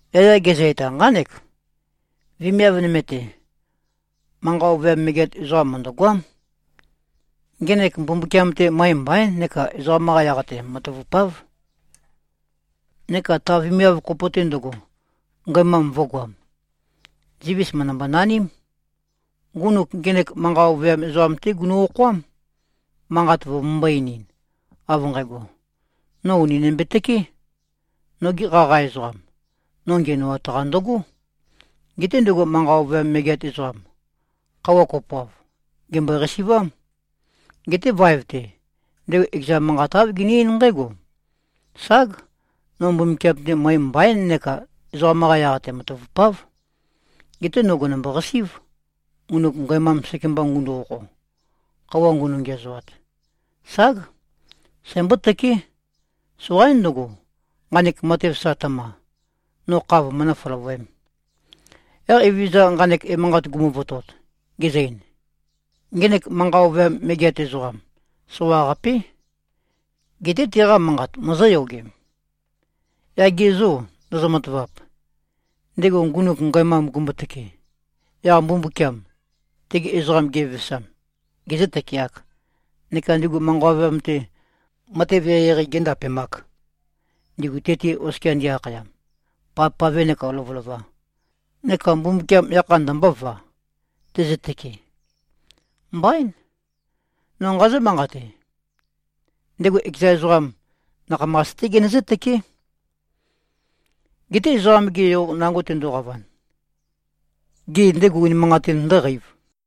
Yaya gezø-eta nqánek, “Vemiav nøme-te, manqa ovøyam megeat ezoqam mø̀ndøgoám. Ngenek Mbumbukiam-te møe mbaín neka ezoqam-qa yaq-te matavupáv. Neka ta vemiav kopo-te ndøgo, ngæmam vø̄goam. Zivis mø̀ndømbo-naním. Ndugu ngenek manqa ovøyam ezoqam-té gunø-okhoám, manqat vømømbō-einin, av nqægo, ‘No ùni nømbetøké. Noge qaqa ezoqam, no ngiænoat-qa ndøgó.’ Geté ndego manqa ovøyam megeat ezoqam, khøuwa kopoav, gèmbøe-qasi꞉vám. Geté vaev-te, ndego ekeza manqat āv gene-eín nqǽgo, ‘Ság! No Mbumbukiam-te møe mbaín neka ezoqam-qa yaq-te matavupáv. Geté no gènømbo-qasí꞉v, ngunuk ngæmam sekemba ngundu-okho, khøuwa ngunø-ngiæzoat. Ság! Sæmbótøké. Soqaín ndøgo, nqanek matev sa tøma, no kha vømønǿ-føløvøēm.’” Yaq Evezøza nqanek emanqat gumuvotot, gezø-ein, “Ngenek manqa ovøyam megeat ezoqam, soqaqapé. Geté teqa manqat mozóyogem? Yaq ge zô, ndozo-matavap, ndego ngunuk ngæmam gumbotøke, yaq Mbumbukiam, tegi ezoqam gevevesam, gezǿ-tøkeāk, neka ndigu manqa ovøyam-te, matev eqeieqei géndapemāk, ndigu te-te oskia ndi-akhayam, pavpave neka lovølova? Neka Mbumbukiam yakha ndømbóva, tezøtøke? Mbaín. No nqazǿ-manqate: Ndego ekeza ezoqam, nakhamas-té genøzǿ-tøké. Geté Ezoqam-ge Yo nango tendoqavan, gê, ndego unimanqatin ndǿqeiv?”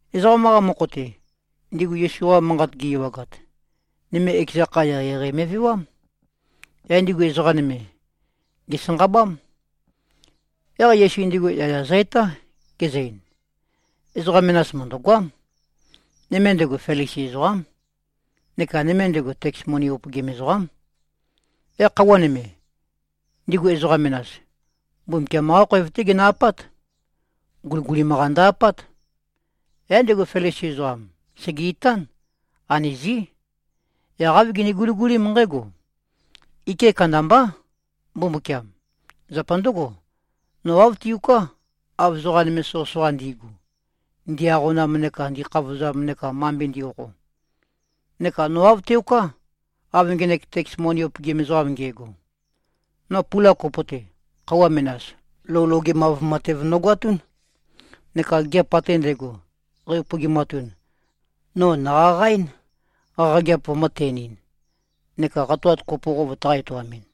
Ezoqam-qa mokho-te, ndigu Yesu-qa manqat gi-ewagat, nøme ekeza kha, eqeieqei me꞉vewám. Yaq ndigu ezoqa nøme, gèsanqabám. Yaq Yesu ndigu yaya zø-etá, gezø-ein, “Ezoqa menas mø̀ndøgoám. Nøme ndego, Felisi ezoqám. Neka nøme ndego, teks moni upøgim ezoqám. Yaq khøuwa nøme, ndigu ezoqa menas, Mbumbukiam-qá khoev-té ginø-apát. Guligulim-qa ndø-apát. Yaq ndego Felisi ezoqam, sège-itán. Anøzí. Yaq āv gene-guligulím nqǽgo, ‘Ike kandambá, Mbumbukiam. Zapa ndǿgo, no āv tiuká, av ezoqa nøme soqøsoqa ndi꞉gu, ndi-aqonam neka ndi꞉khavozam neka mambe ndi꞉-okho. Neka no āv teoká, av ngenek teks moni upøgim ezoqam nge꞉go. No pula kopo-te, khøuwa menas, lou logemav matev nogoatún. Neka gigiap ate ndægo, qæ-upøgimatun, no nòqaqaɨ́n, qaqageap vømø̄-ten-ɨn, neka qatoat kopo qo vøtaqā-etoamɨn.’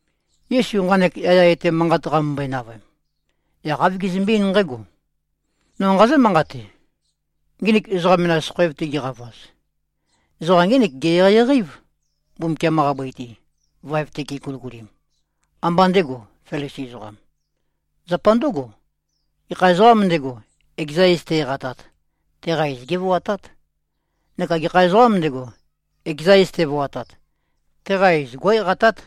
Yesu nqanek yaya etæ manqat qamømbøe-navøem, yaq āv gezømbe-eín nqǽgo, “No nqazǿ-manqate: Nginik ezoqa menas khoev-te giqavaz, ezoqam ngének ge-eqeieqei-év, Mbumbukiam-qa bøi-te, vaev-te geguligulim. Ambá ndego, Felisi ezoqam. Zapa ndǿgo, gekha ezoqām ndego, ekeza iz te-eqatat, teqa iz gévoatát. Neka gekha ezoqām ndego, ekeza iz tevoatat, teqa iz gó꞉-eqatát.”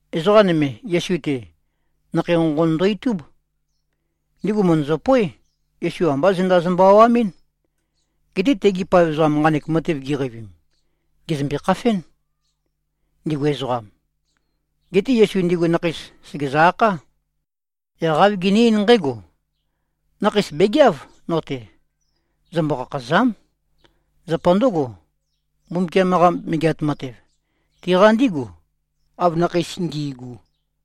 Ezoqa nøme, Yesu-te, nakhei nqonqon ndo-itub. Ndigu mø̀ndøzøpoé, Yesu ambá zenda zømbø-awamɨ́n. Geté tegi paev ezoqam nqanek matev giqeivim, gèzømbe-khafén, ndigu ezoqam. Geté Yesu ndigu nakheis, sègezø-akhá. Yaq āv gene-eín nqǽgo, “Nakheis bègeáv, no-te. Zømbo-khakhàza᷄m. Zapa ndǿgo, Mbumbukiam-qa Megeat Matev, tiqa ndígu, av nakheis ngi꞉gu.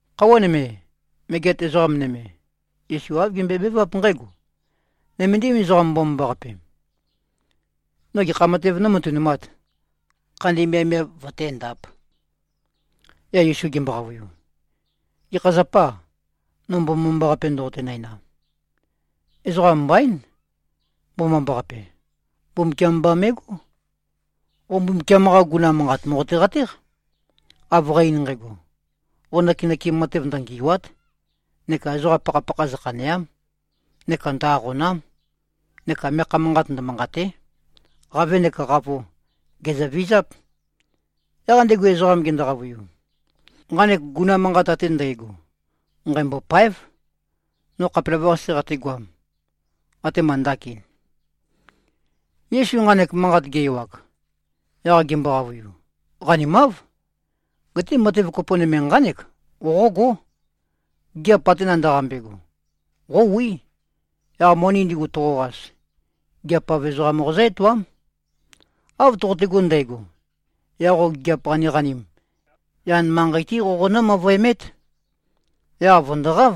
Khøuwa nøme, megeat ezoqa nøme, Yesu āv gembøebeváp nqǽgo, “Nøméndim ezoqam mbomambaqape. No gekha matev nómatønumāt, khandi miavmiav vøténdāp?” Yaq Yesu gembo-qavøiu, “Gekha zapâ, no mbomambaqape ndoqote-næna? Ezoqa mbaín, mbomambaqape. Mbumbukiam mba me꞉gó. Qo Mbumbukiam-qa guguna manqat mòqote-qatéq, av qæ-ein nqægo: Qo nøkenøkem matev ndøngì꞉wa᷄t. Neka ezoqa pakhapakha zøkhanèa᷄m. Neka ndø-aqòna᷄m. Neka meakha manqat ndømanqàte᷄. Qavē neka qavo, gèzøvizáp.” Yaq ndego ezoqam gendo-qavøiu, “Nqanek guguna manqat ate ndægo, nqæmbôpáev, no khapelavøqase qategoam, atema ndakin.” Yesu nqanek manqat ge-ewag, yaq gembo-qavøiu, “Qanimáv. Geté matev kopo nøme nqánek qoqógó. Gigiap ate nandaqambe꞉go, qówí. Yaq moni ndigu toqoqas, gigiap-av ezoqam qozǿ-etoám. Av toqotego ndægo, yaq qo gigiap qaniqanim, yan manqei-té qoqonǿ-møvøemét. Yaq vø̀ndoqáv.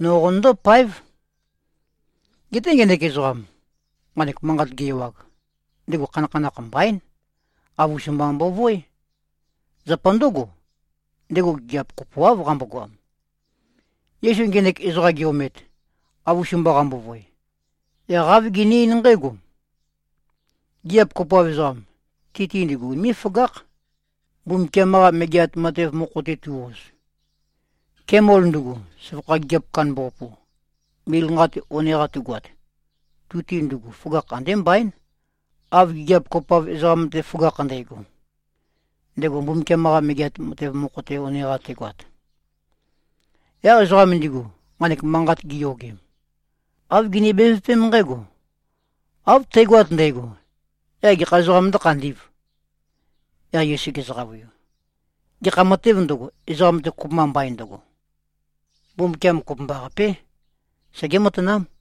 No qonøndó-páev.” Geté ngenek ezoqam, nqanek manqat ge-ewag, ndego khanakhanakh mbaín. Avus-mba mbovoé. Zapa ndǿgo, ndego gigiap kopoáv qambogoam. Yesu ngenek ezoqam ge-omet, avus-mba qambovoe, yaq āv gene-eín nqǽgo, “Gigiap kopoav ezoqam, ti-te ndigu unimé꞉-føgákh, Mbumbukiam-qa Megeat Matev mokho-te tu꞉-oz. Kemol ndugu, søvakha gigiap kandambaqapu, mil nqa-te one-qa tugoat, tu-te ndugu føgakh andé mbaín, av gigiap kopoav ezoqam-te føgakh ndægo, ndego Mbumbukiam-qa Megeat Matev mokho-te one-qa tegoat.” Yaq ezoqam ndigu, nqanek manqat giyogem, āv gini-bevøpém nqǽgo, “Av tægoat ndægo, yaq gekha ezoqām ndǿkhandī꞉v?” Yaq Yesu gezø-qavøiu, “Gekha matēv ndøgo, ezoqam-te kopømba mbain ndøgo, Mbumbukiam kopømbaqapé, segé-matanám.”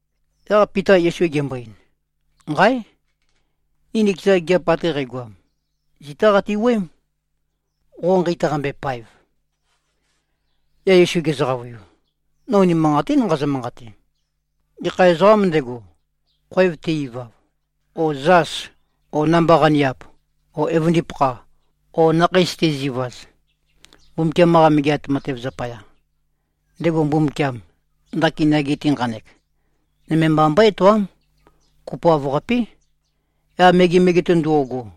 Yaq Pita Yesu gembo-ein, “Nqáe! Ni nikeza gigiap ate qægoam, zitá qati-wuøém, qo nqeitaqambe-paev.” Yaq Yesu gezø-qavøiu, “No unimanqatín nqazø-manqate. Gekha ezoqām ndego, khoev te-ivav o zas o namba-qaniap o evøndipakha o nakheis tezivaz, Mbumbukiam-qa Megeat Matev zapaya, ndego Mbumbukiam, ndakin yage-te nqanek, nøme mba mbøé-etoám, kopoav-qapé, yaq megemege-te ndo꞉go,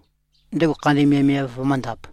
ndego khandi miavmiav vømǿndāp.”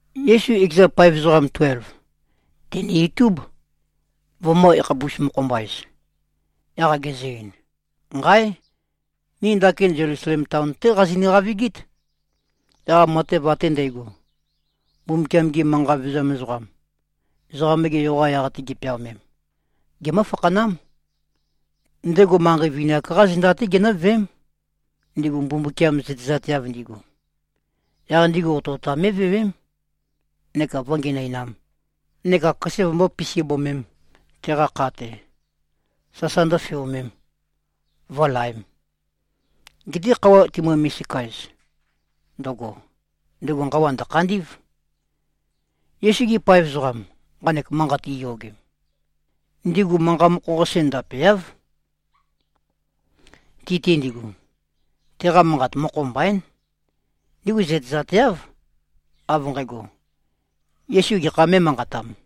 Yesu ekeza paev ezoqam tuelv, tène-itúb, vømø̄-yakhapus-mokho-mba-ez, yaq gezø-ein, “Nqáe! Ni ndakin Zelusalem taon-té qazinø-qavigít. Yaq matev ate ndægo, Mbumbukiam-gi manqa vevezam ezoqam, Ezoqam-ge Yo-qa yaq-te gi꞉peaomem, gemǿ-fakhanám. Ndego manqei vini-ak-qá zenda-té ginǿveém, ndigu Mbumbukiam zøtezateav ndigu. Yaq ndigu otøotam mé꞉vewém neka vǿngenøinām neka køse vømbøé-pisibømēm teqa kha-te, sasa ndǿfeomēm, vǿlaēm. Geté khøuwa timømbo-misika-ez ndøgo, ndego nqawa ndø̀khandí꞉v.” Yesu-gi paev ezoqam, nqanek manqat giyogem, ndigu manqa mokho-qase ndapeáv. Ti-te ndigu, teqa manqat mokho mbaín. Ndigu zøtezateáv, av nqægo, Yesu gekhā mé꞉manqatam.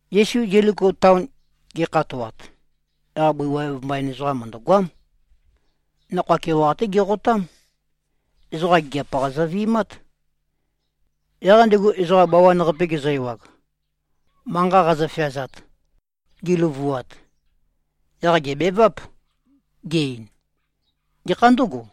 Yesu Zeliko taon ge꞉khatoat, yaq bøi waev mbain ezoqam mø̀ndøgoám. Nakhoa keoqa-té geqotám. Ezoqa gigiap-qa zøvi꞉mát. Yaq ndego ezoqa bawan-qape gezø-ewag, manqa qazøfeazat, giløvuat, yaq gèbeváp, ge-ein, “Gekhā ndǿgo?”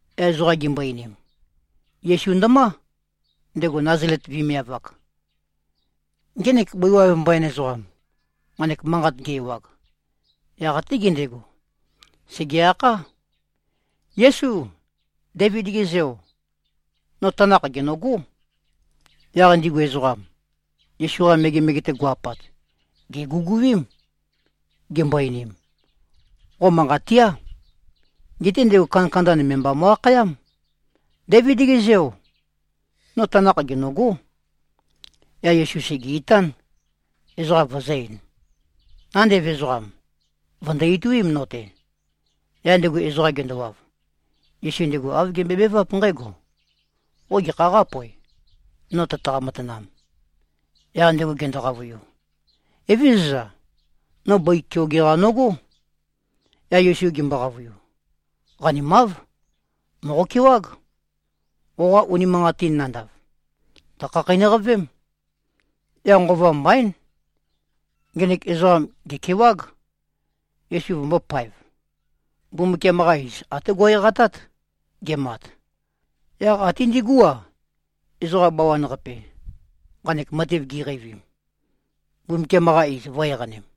Yaq ezoqa gimbo-einim, “Yesu ndømá, ndego Nazalet vemiav-ak.” Ngenek bøi waev mbain ezoqam, nqanek manqat ge-ewag, yaq até gendego, sège-akhá, “Yésu. Déivid-ge Zeo. No tanakh gènøgó.” Yaq ndigu ezoqam, Yesu-qa megemege-te go꞉-apat, gèguguím, gimbo-einim, “Qo manqat tía.” Geté ndego kandakanda nøme mba mo꞉-akhayám, “Déivid-ge zeo. No tanakh gènøgó!” Yaq Yesu sège-itán, ezoqa vøzø̄-ein, “Nandev ezoqam, vø̀ndo-ituím, no-te.” Yaq ndego ezoqam gendowav, Yesu ndego āv gembøebeváp nqǽgo, “Qo gekhā qápoev, no tøtaqa-matanam?” Yaq ndego gendo-qavøiu, “Evézøza. No bøi keoge-qa nøgó.” Yaq Yesu gembo-qavøiu, “Qanimáv. Mòqokewág. Qoqa unimanqatin nandav, tø̀khakheinøqavém.” Yaq nqova mbaín. Ngenek ezoqam gèkewág, Yesu vømbōpaev. Mbumbukiam-qa iz até go꞉-eqatát, gemat. Yaq até ndigú-a, ezoqa bawan-qape, nqanek matev giqeivim, Mbumbukiam-qa iz vø̄-eqanem.